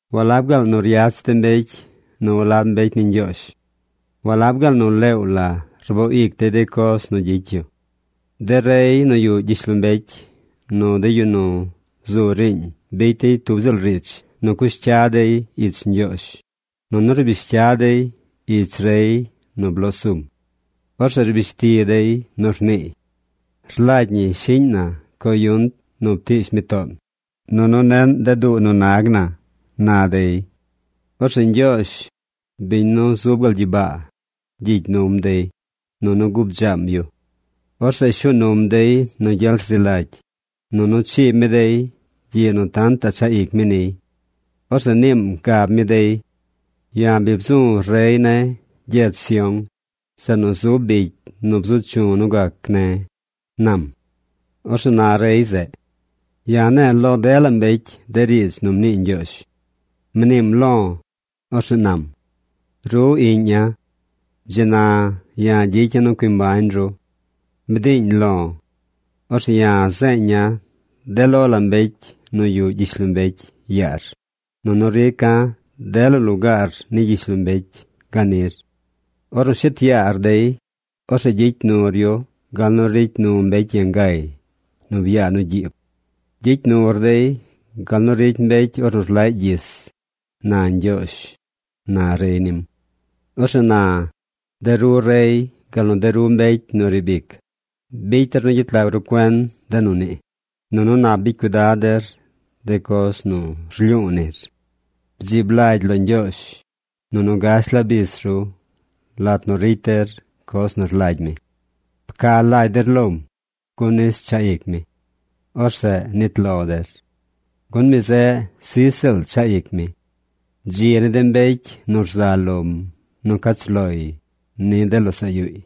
¿Walab gaal nu ryach de mbecy nu walab mbecy ni Ñgyoozh? ¿Walab gaal nu leew la rboo ic dey de coz nu gyicy yu? De rey nu yuꞌ gyishlombecy nu de yu nu zu riiñ bicy dey tub ziꞌl riidz nu cush cya dey ich Ñgyoozh, nunu rbish cya dey ich rey nu bloo sum. Orzeꞌ rbish ti dey nu rniiy: “Rlagy ñi shiꞌñ na coyunt nu ptiish mi toon, nunu neꞌn de duu nu nag na”, na dey. Orzeꞌ Ñgyoozh, biñ nu zub gal gyibaa, gyigy num dey, nunu gubdzaam yu. Orzeꞌ shuu num dey nu gyel rzi lagy, nunu chiib mi dey gyiꞌ nu tantaꞌ chaꞌ ic mi niy. Orzeꞌ niim gab mi dey: “Ya̱ bi bzu̱ rey ne̱ gyedz Sión, zeꞌ nu zub bicy nu bzu chu̱ nu gac ne̱”, nam. Orzeꞌ na rey zeꞌ: “Ya̱ ne̱e̱ lo dela mbecy de riidz nu mnii Ñgyoozh. Mniim lo̱, orzeꞌ nam: ‘Ru iꞌña̱. Dzi na ya̱ gyicya̱ nu cui mbañ ru. Bdiiñ lo̱. Orzeꞌ ya̱ zeeña̱ de lo la mbecy nu yuꞌ gyishlombecy yaar, nunu rica̱ dela lugaar ni gyishlombecy ganir. Ornu shet yaar dey, orzeꞌ gyicy nur yu gal nu ricy nu mbecy yangay nu byaa nu gyiib. Gyicy nur dey gal nu ricy mbecy ornu rlaꞌy gyis’, na Ñgyoozh”, na rey nim. Orzeꞌ na, de ru rey gal nu de ru mbecy nu riib ic, bicy der nu gyet lag ru cuen de nu nii, nunu nap bicy cuidad der de coz nu rlyu̱u̱ nir. Bdzib lagy lo Ñgyoozh, nunu gash la bis ru lat nu ricy der coz nu rlagy mi. Pca lagy der lom, gun nis chaꞌ ic mi. Orzeꞌ nit lo der. Gun mi zeꞌ sij ziꞌl chaꞌ ic mi. ¡Dzi ni de mbecy nu rza lom nu cach loy lo de losaꞌ yuuy!